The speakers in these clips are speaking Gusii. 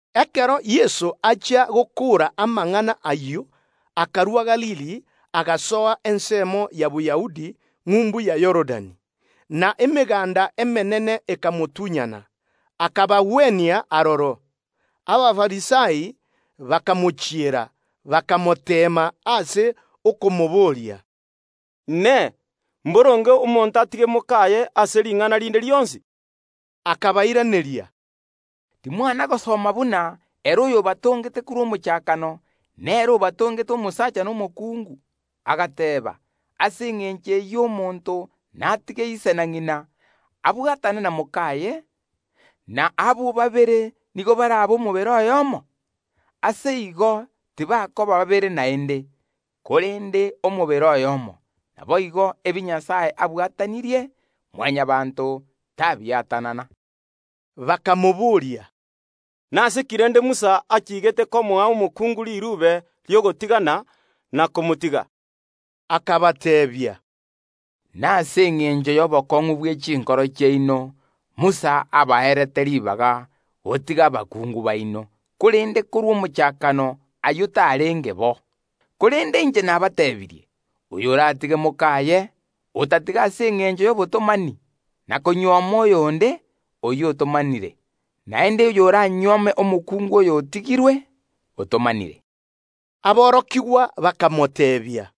Ekero Yeso achia gokoora gokwana amang’ana ayio, akarua Galili, agasoa ensemo ya Boyahudi ng’umbu ya Yorodani; na emeganda emenene ekamotunyana, akabagwenia aroro. Abafarisai bakamochiera, bakamoteema ase okomoboria, “Inee! Mboronge omonto atige mok’aye ase ring’ana rinde rionsi?” Akabairaneria, “Timwana gosoma buna ere oyobatongete korwa omochakano, nere obatongete omosacha na omokungu, agateeba: Ase engencho eyio omonto natige ise na ng’ina, abwatane na mok’aye, na abwo babere nigo barabe omobere oyomo? Ase igo tibakoba babere naende, korende omobere oyomo. Naboigo, ebi Nyasae abwatanirie, Mwanyabaanto tabiatanana.” Bakamobooria, “Nase ki rende Musa achiigete komoa omokungu riruube ri’ogotigana, na komotiga?” Akabateebia, “Nase engencho y’obokong’u bwe chinkoro chiaino Musa abaete ribaga gotiga abakungu baino, korende ayio tarenge bo korwa omochakano. Korende inche nabateebirie, oyoratige mok’aye, otatiga ase engencho y’obotomani, na konyuoma oyonde, oyio otomanire; naende oy’oranyuome omokungu oyotigirwe, otomanire.” Aborokigwa bakamoteebia,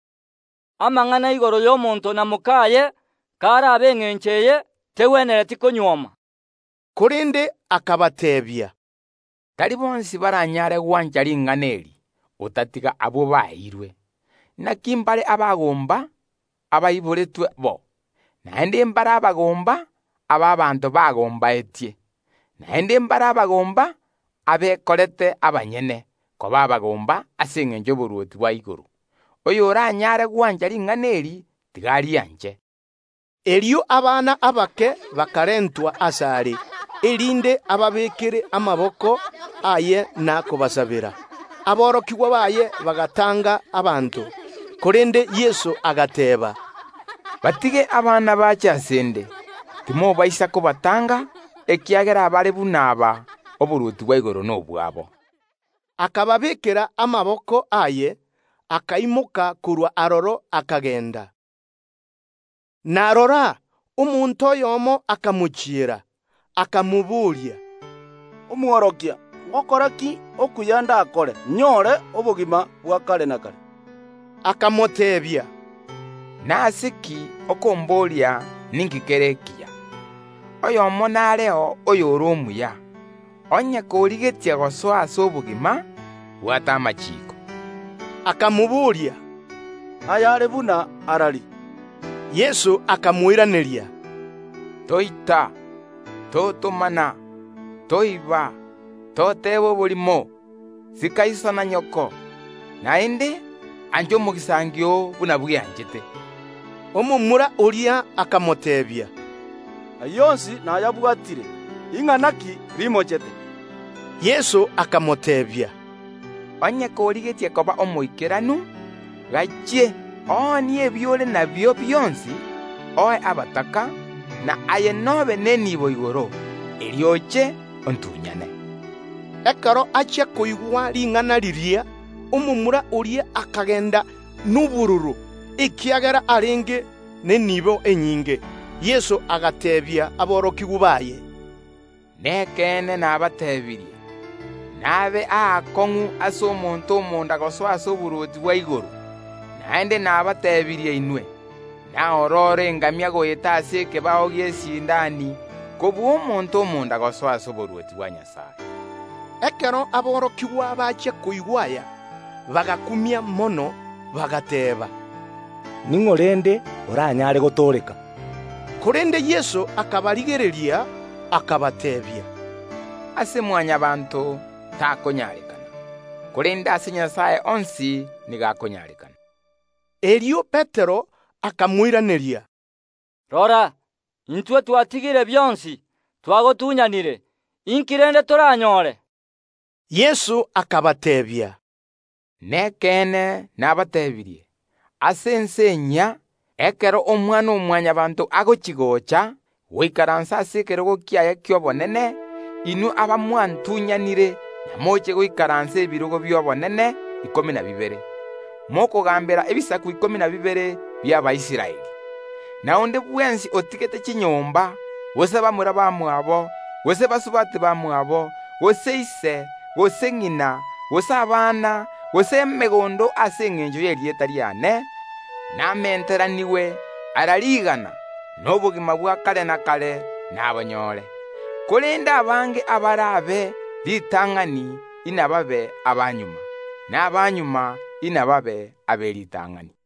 “Amang’ana igoro y’omonto na mok’aye k’arabe engencho eye, tegwenereti konywoma.” Korende akabateebia, “Tari bonsi baranyare gwancha ring’ana eri, otatiga abwo baeirwe. Inaki mbare abagomba abaiboretwe bo, naende mbare abagomba aba abanto bagombaetie, naende mbare abagomba abekorete abanyene koba abagomba ase engencho y’oborwoti bwa igoro. Oyoranyare gwancha ring’ana eri, tiga arianche.” Erio abana abake bakarentwa ase Yeso, erinde ababeekere amaboko aye na kobasabera. Aborokigwa baye bagatanga abanto, korende Yeso agateeba, “Batige abana bache ase ’nde, timobaisa kobatanga, ekiagera abare buna aba, oborwoti bwa igoro n’obwabo.” Akababeekera amaboko aye, akaimoka korwa aroro, akagenda. Na rora, omonto oyomo akamochiera, akamobooria, “Omworokia ’mboseera ki ndakore ’nyore obogima bwa kare na kare?” Akamoteebia, “Nase ki okomboria ninki kere ekiya? Nareo oyomo bweka oyore omuya. Onye korigetie gosoa ase obogima, bwata amachiiko.” Akamoboria, “Ayare buna arari?” Yeso akamoiraneria, “Toita, Totomana, Toiba, Toteba oborimo, sika iso na nyoko; naende: Ancha omogisangio oo buna bweanchete.” Omomura oria akamoteebia, “Ayio onsi nayabwatire; ing’ana ki rimochete?” Yeso akamoteebia, “Onye korigetie koba omoikeranu, gachie, oonie ebio ore nabio bionsi, oe abataka, na aye n’obe neniibo igoro; erio oche ontunyane.” Ekero achia koigwa ring’ana riria, omomura oria akagenda nobororo, ekiagera arenge neniibo enyinge. Erio Yeso agateebia aborokigwa baye, “Nekeene nabateebirie: Nabe aakong’u ase omonto omonda gosoa ase oborwoti bwa igoro. Naende nabateebirie inwe, naororo engamia goeta ase ekebao gi’esindani, kobua omonto omonda gosoa ase oborwoti bwa Nyasae.” Ekero aborokigwa bachia koigwa aya, bagakumia mono, bagateeba, “Ning’o rende oranyare gotooreka?” Korende Yeso akabarigereria, akabateebia, “Aya takonyarekana ase Mwanyabaanto, korende ase Nyasae onsi nigo akonyarekana.” Erio Petero akamoiraneria, “Rora, intwe twatigire bionsi, twagotunyanire, inki rende toranyore?” Yeso akabateebia, “Nekeene nabateebirie: Ase ense enyia, ekero Omwana-o-Mwanyabaanto agochi‐gocha gaikaransete ase ekerogo kiaye ki’obonene, inwe abamwantunyanire inamoche goikaransera ebirogo bi’obonene ikomi na bibere, mokogaambera ebisaku ikomi na bibere bi’Abaisraeli. Na onde bwensi otigete chinyomba, gose bamura bamwabo, gose basubati bamwabo, gose ise, gose ng’ina, gose abana, gose emegondo ase engencho y’erieta riane, namenteranigwe ara rigana, na obogima bwa kare na kare nabonyore. Korende abange abare ab’eritang’ani inababe abamagega, na abamagega inababe ab’eritang’ani.